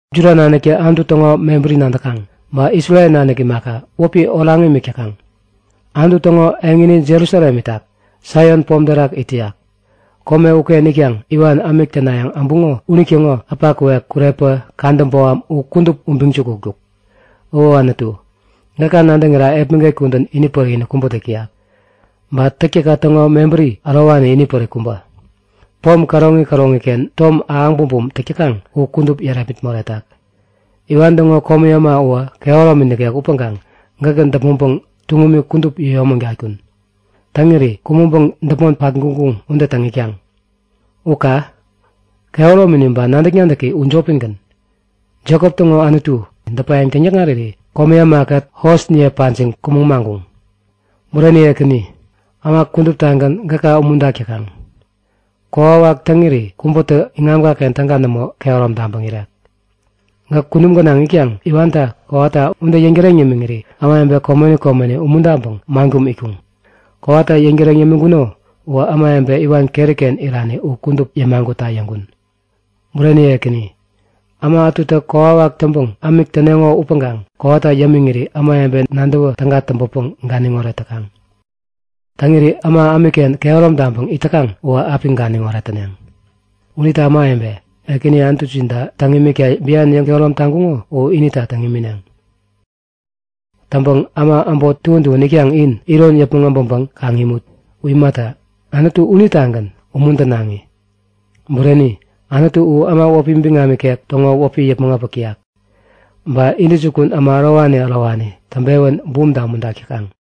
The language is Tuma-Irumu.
Juda naniktä Anutu täŋo mebäri nadäkaŋ. Ba Isrel nanik imaka, wäpi oraŋ imik täkaŋ. Anutu täŋo eŋini Jerusalem itak. Saion pom terak it täyak. Kome uken itkaŋ iwan ämik tänayäŋ äbuŋo unitäŋo äpa kuwek, kurepä, käda boham u kudup ubiŋ-jukutkuk. O Anutu, gäka nadäŋira epmäget kudän inipärik-inik kubä täk täyak. Ba täktäkka täŋo mebäri ärowani inipärik kubä, pom käroŋi käroŋiken tom ahäŋ bumbum täk täkaŋ u kudup yärepmit moretak. Iwan täŋo komi äma uwä kehäromi nikek upäŋkaŋ gäkä däpmäŋpäŋ tuŋumi kudup yäyomägatkun. Täŋiri kumäŋpäŋ däpmon patguŋ-guŋ ude täŋ itkaŋ. U ka! Kehäromini ba nadäk-nadäki u jopigän. Jekop täŋo Anutu, däpayäŋ täŋyäkŋariri komi ämakät hosniye pajiŋ kumäŋ maŋkuŋ. Bureni Ekäni, äma kuduptagän gäka umuntak täkaŋ. Kokwawak täŋiri kubätä iŋamkaken täga nämo kehärom taŋpäŋ irek. Gäk kunum gänaŋ itkaŋ iwanta kowata ude yäŋtäreŋ yämiŋiri ämawebe komeni komeni umuntaŋpäŋ man kum itkuŋ. Kowata yäŋtäreŋ yämiŋkuno uwä ämawebe iwan keriken irani u kudup yämagutta yäŋkun. Bureni Ekäni, äma ätutä kokwawak täŋpäŋ ämik täneŋo upäŋkaŋ kowata yämiŋiri ämawebe nadäwä täga täŋpäpäŋ ganiŋoret täkaŋ. Täŋirä äma ämikken kehärom taŋpäŋ it täkaŋ uwä api ganiŋoret täneŋ. Unita ämawebe, Ekäni Anutujinta täŋ imikta bian yäŋkehärom taŋkuŋo u inita täŋ imineŋ. Täŋpäŋ äma äbot tuän tuän itkaŋ in, iron yäpmäŋ äbäŋpäŋ kaŋ imut. U imata, Anutu unitagän umuntänaŋi. Bureni, Anutu u äma wäpi biŋam ikek täŋo wäpi yäpmäŋ äpäk täyak. Ba intäjukun äma ärowani ärowani täŋpewän bumta umuntak täkaŋ.